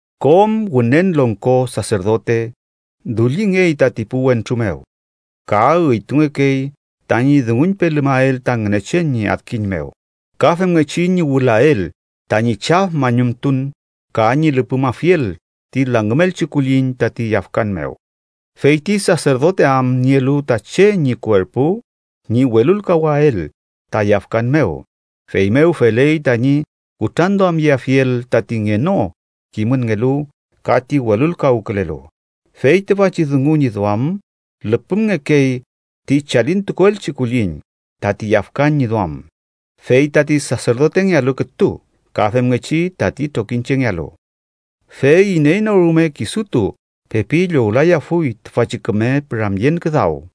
Kom Wünen Longko Saserdote dullingey tati pu wentru mew, ka üytungekey tañi dunguñpelumael ta Ngünechen ñi adkiñ mew, ka femngechi ñi wülael tañi chaf mañumtun ka ñi lüpümafiel ti langümelchi kulliñ tati yafkan mew. Fey ti saserdote am nielu ta che ñi kuerpu ñi welulkawael ta yafkan mew, feymew feley tañi kutranduamyeafiel tati ngeno kimünngelu ka ti welulkawkülelu. Fey tüfachi dungu ñi duam, lüpümngekey ti chalintukuelchi kulliñ tati yafkan ñi duam fey tati saserdotengealu kütu ka femngechi tati trokiñchengealu. Fey iney no rume kisutu pepi llowlayafuy tüfachi küme püramyen küdaw,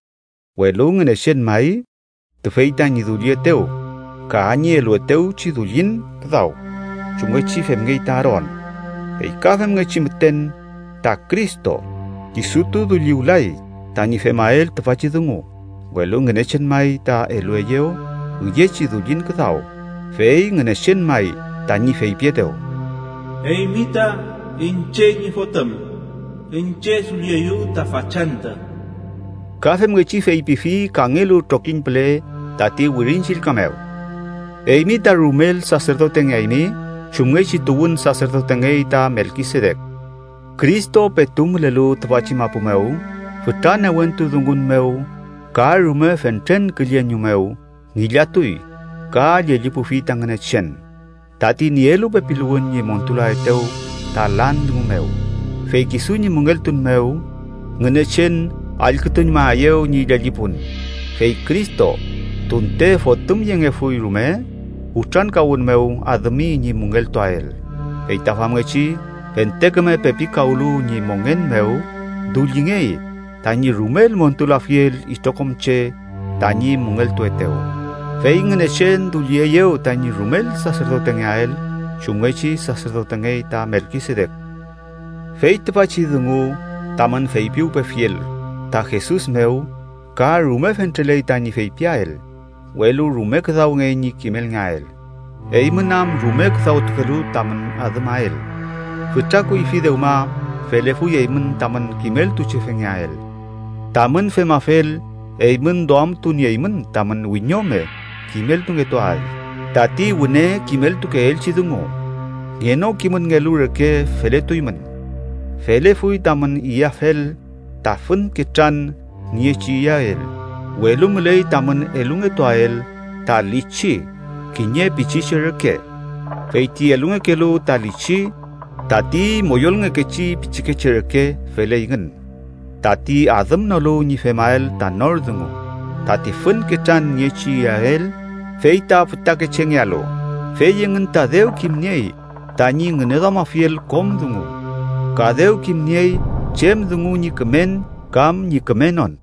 welu Ngünechen may tüfey tañi dullietew ka ñi eluetewchi dullin küdaw, chumngechi femngey ta Aaron. Fey ka femngechi müten, ta Cristo kisutu dulliwlay tañi femael tüfachi dungu, welu Ngünechen may ta elueyew üyechi dullin küdaw, fey Ngünechen may tañi feypietew: “Eymi ta iñche ñi fotüm; iñche dullieyu ta fachantü.” Ka femngechi feypifi kangelu trokiñ püle tati Wirin Chillka mew: “Eymi ta rumel saserdotengeaymi chumngechi tuwün saserdotengey ta Melkisedek.” Cristo petu mülelu tüfachi mapu mew, fütra newentu dungun mew ka rume fentren külleñu mew ngillatuy ka llellipufi ta Ngünechen, tati nielu pepiluwün ñi montulaetew ta lan dungu mew, fey kisu ñi müngeltun mew, Ngünechen allkütuñmaeyew ñi llellipun. Fey Cristo, tunte Fotümyengefuy rume, kutrankawün mew adümi ñi müngeltuael. Fey ta famngechi fente küme pepikawlu ñi mongen mew, dullingey tañi rumel montulafiel itrokom che tañi müngeltuetew. Fey Ngünechen dullieyew tañi rumel saserdotengeael chumngechi saserdotengey ta Melkisedek. Fey tüfachi dungu tamün feypiwpefiel ta Jesus mew ka rume fentreley tañi feypiael, welu rume küdawngey ñi kimelngeael, eymün am rume küdawtukelu tamün adümael. Fütra kuyfi dewma felefuy eymün tamün kimeltuchefengeael. Tamün femafel, eymün duamtunieymün tamün wiñome kimeltungetuael tati wüne kimeltukeelchi dungu. Ngenokimünngelu reke feletuymün. Felefuy tamün iyafel ta fün ketran niechi iyael, welu müley tamün elungetuael ta lichi kiñe pichiche reke. Fey ti elungekelu ta lichi tati moyolngekechi pichikeche reke feleyngün, tati adümnolu ñi femael ta nor dungu. Tati fün ketran niechi iyael fey ta fütakechengealu, fey engün ta dew kimniey tañi ngüneduamafiel kom dungu, ka dew kimniey chem dungu ñi kümen kam ñi kümenon.